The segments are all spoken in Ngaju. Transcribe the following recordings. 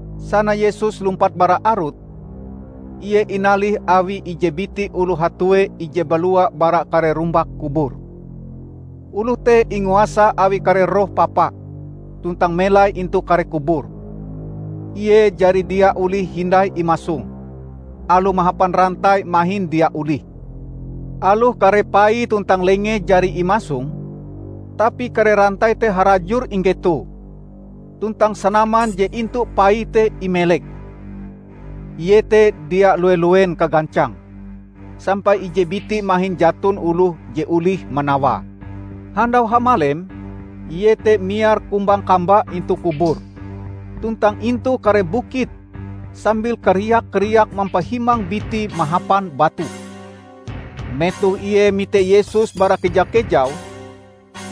Sana Yesus lumpat bara arut, Ie inalih awi ije biti oloh hatue je balua bara kare rumbak kubur. Oloh te inguasa awi kare roh papa tuntang melai intu kare kubur. Ie jari dia olih hindai imasong; aloh mahapan rantai mahin dia olih. Aloh kare paie tuntang lengee jari imasong, tapi kare rantai te harajur inggetoe, tuntang sanaman je intu paie te imeleke. Ie te dia lue-luen kagancange sampai ije biti mahin jaton oloh je olih manawae. Handau hamalem Ie te miar kumbang-kamba intu kubur tuntang intu kare bukit sambil kariak-kariak mampahimang bitie mahapan batu. Metoh ie mite Yesus bara keja-kejau,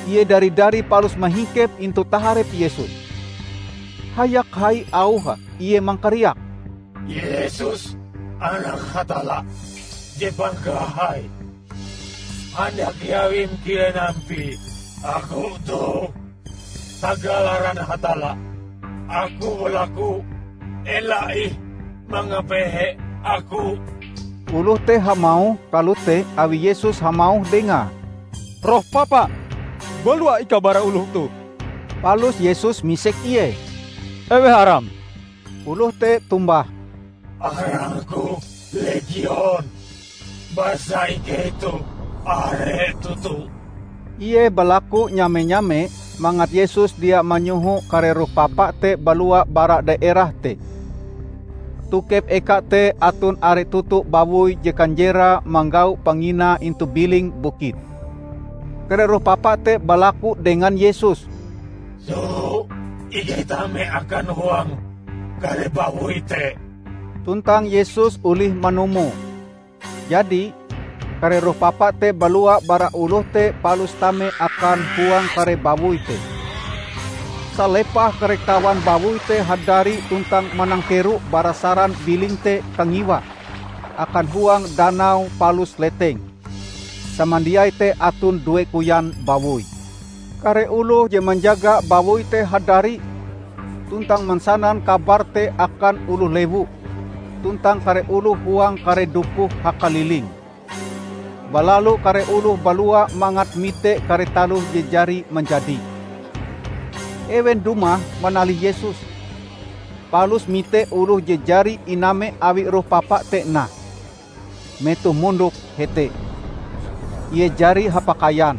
ie dari-dari palus mahingkep intu taharep Yesus. Hayak hai auhe ie mangkariak, "Yesus Anak Hatalla, Je Pangkahai! Handak iawim kilen ampie aku toh? Tagal aran Hatalla aku balaku, ela ih mangapehe aku!" ( Oloh te hamauh kalote awi Yesus hamauh dengae, "Roh papa, balua ikau bara oloh toh!") Palus Yesus misek ie, "Eweh aram?" Oloh te tombah, "Arangku 'Legion' -- basa ikei toh are toto!" Ie balaku nyame-nyame mangat Yesus dia manyoho kare roh papa te balua bara daerah te. Tokep eka te aton are toto bawoi je kanjerae manggau panginae intu biling bukit. Kare roh papa te balaku dengan Yesus, "Soho ikei tame akan huang kare bawoi te." Tuntang Yesus olih manumoe. Jadi, kare roh papa te balua bara oloh te palus tame akan huang kare bawoi te. Salepah kare kawan bawoi te hadari tuntang manangkero bara saran biling te kangiwa akan huang danau palus leteng -- samandiaie te aton due koyan bawoi. Kare oloh je manjaga bawoi te hadari, tuntang mansanan kabar te akan oloh lewu tuntang kare oloh huang kare dukuh hakalilinge. Balalu kare oloh balua mangat mite kare taloh je jari manjadi. Ewen dumah manalih Yesus, palus mite oloh je jari iname awi roh papa te nah, metohe mondok hete. Ie jari hapakaian,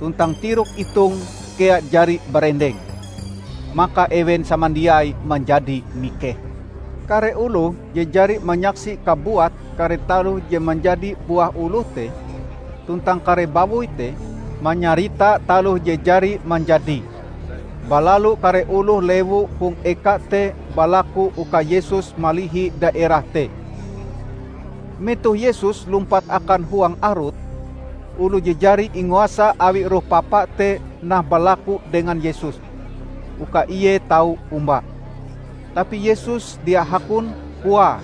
tuntang tirok itonge kea jari barendeng. Maka ewen samandiai manjadi mikeh. Kare oloh je jari manyaksi kabuat kare taloh je manjadi buah oloh te tuntang kare bawoi te, manyarita taloh je jari manjadi. Balalu kare oloh lewu hong eka te balaku uka Yesus malihi daerah te. Metoh Yesus lumpat akan huang arut, oloh je jari inguasa awi roh papa te nah balaku dengan Yesus uka ie tau omba. Tapi Yesus dia hakon, koae,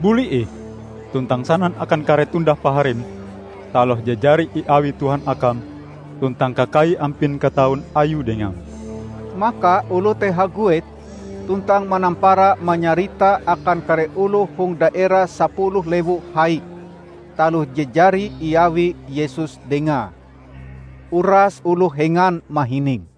"Buli ih tuntang sanan akan kare tondah paharim taloh je jari iawi Tuhan akam tuntang kakai ampin kataun Ayue dengam!" Maka oloh te haguet, tuntang manampara manyarita akan kare oloh hong daerah Sapuluh Lewu Hai taloh je jari iawi Yesus dengae. Uras oloh hengan mahininge.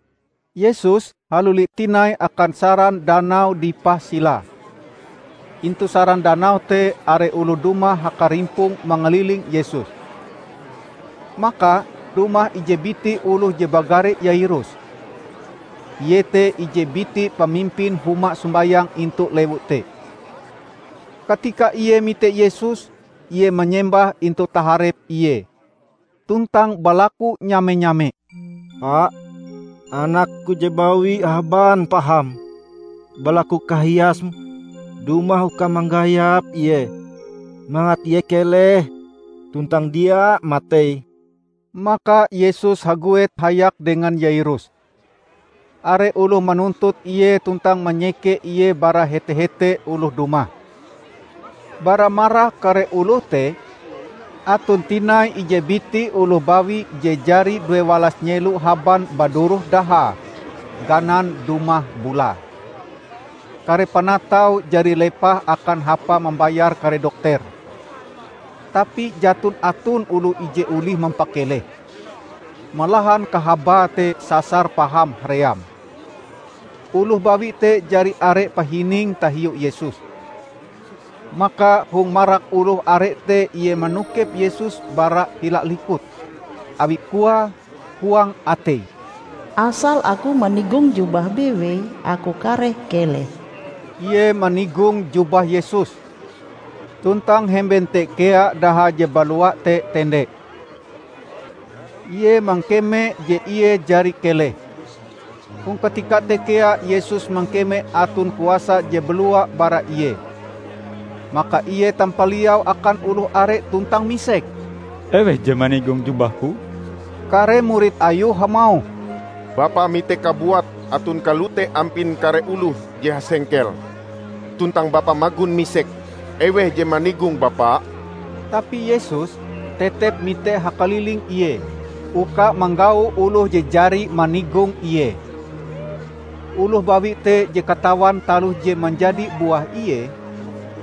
Yesus haluli tinai akan saran danau dipah silae. Intu saran danau te, are oloh dumah hakarimpong mangaliling Yesus. Maka dumah ije biti oloh je bagare Yairus. Ie te ije biti pamimpin huma sombayang intu lewu te. Katika ie mite Yesus, ie manyembah intu taharep Ie, tuntang balaku nyame-nyame, "Pa, anakku je bawi haban paham. Balaku kahiasm dumah uka manggayap ie, mangat ie keleh tuntang dia matei!" Maka Yesus haguet hayak dengan Yairus. Are oloh manuntut Ie tuntang manyeke Ie bara hete-hete oloh dumah. Bara marak kare oloh te aton tinai ije biti oloh bawi je jari duewalas nyelo haban baduroh dahae ganan dumah bulae. Kare panataue jari lepah akan hapa mambayar kare dokter, tapi jaton aton oloh je olih mampakelehe, malahan kahabae te sasar paham haream. Oloh bawi te jari are pahininge tahiu Yesus. Maka hong marak oloh are te ie manokep Yesus bara hila likut, awi koae huang ateie, "Asal aku manigong jubahe bewei aku kareh keleh!" Ie manigong jubah Yesus, tuntang hemben te kea daha je balua te tende. Ie mangkeme je ie jari keleh. Hong katika te kea Yesus mangkeme aton kuasa je balua bara Ie. Maka Ie tampaliau akan oloh are tuntang misek, "Eweh je manigong jubah-Ku?" Kare murid Ayue hamauh, "Bapa mitee kabuat aton kalote ampin kare oloh je hasengkel. Tuntang Bapa magon misek, eweh je manigong Bapa?" Tapi Yesus tetep mite hakaliling Ie uka manggau oloh je jari manigong Ie. Oloh bawi te je katawan taloh je manjadi buah ie,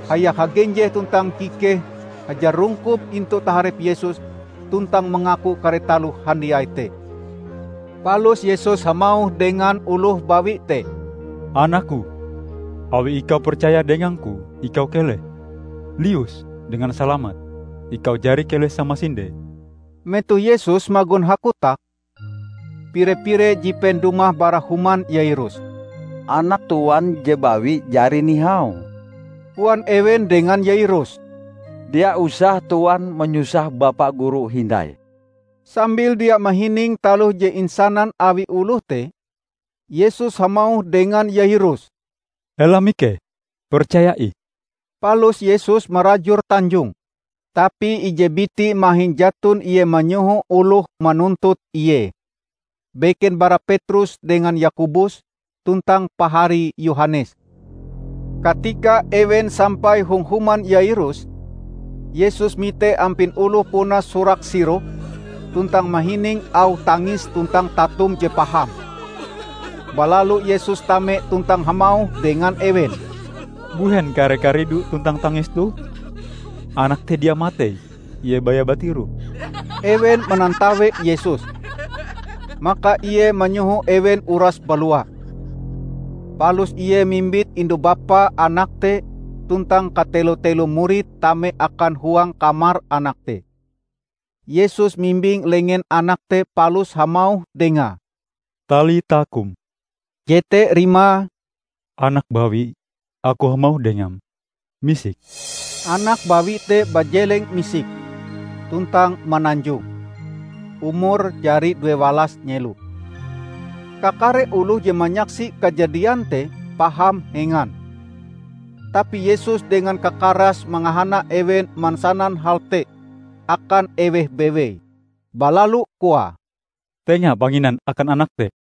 hayak hagenjeh tuntang kikehe hajarungkop intu taharep Yesus tuntang mangaku kare taloh handiai te. Palus Yesus hamauh dengan oloh bawi te, "Anak-Ku, awi ikau percaya dengang-Ku, ikau keleh! Lius dengan salamat. Ikau jari keleh samasinde!" Metoh Yesus magon hakotak, pire-pire jipen dumah bara human Yairus. "Anak tuan je bawi jari nihau," koan ewen dengan Yairus. "Dia usah tuan manyusah Bapa Guru hindai." Sambil dia mahining taloh je insanan awi oloh te, Yesus hamauh dengan Yairus, "Ela mikeh, percaya ih!" Palus Yesus marajur tanjonge, tapi ije biti mahin jaton Ie manyoho oloh manuntut Ie, beken bara Petrus dengan Yakobus tuntang paharie Yohanes. Katika ewen sampai hong human Yairus, Yesus mite ampin oloh puna surak-sirok, tuntang mahining auh tangis tuntang tatum je paham. Balalu Yesus tame tuntang hamauh dengan ewen, "Mbuhen kare karidu tuntang tangis toh? Anak te dia matei; ie baya batiroh!" Ewen manatawe Yesus. Maka Ie manyoho ewen uras balua. Palus Ie mimbit indu-bapa anak te tuntang katelo-telo murid tame akan huang kamar anak te. Yesus mimbing lengen anak te palus hamauh dengae, "Talita kum," jete rimae, "Anak bawi, aku hamauh dengam: misik!" Anak bawi te bajeleng misik, tuntang mananjong. (Umure jari duewalas nyelo.) Kakare oloh je manyaksi kajadian te paham hengan! Tapi Yesus dengan kakarase mangahana ewen mansanan hal te akan eweh bewei. Balalu koae, "Tenga panginan akan anak te."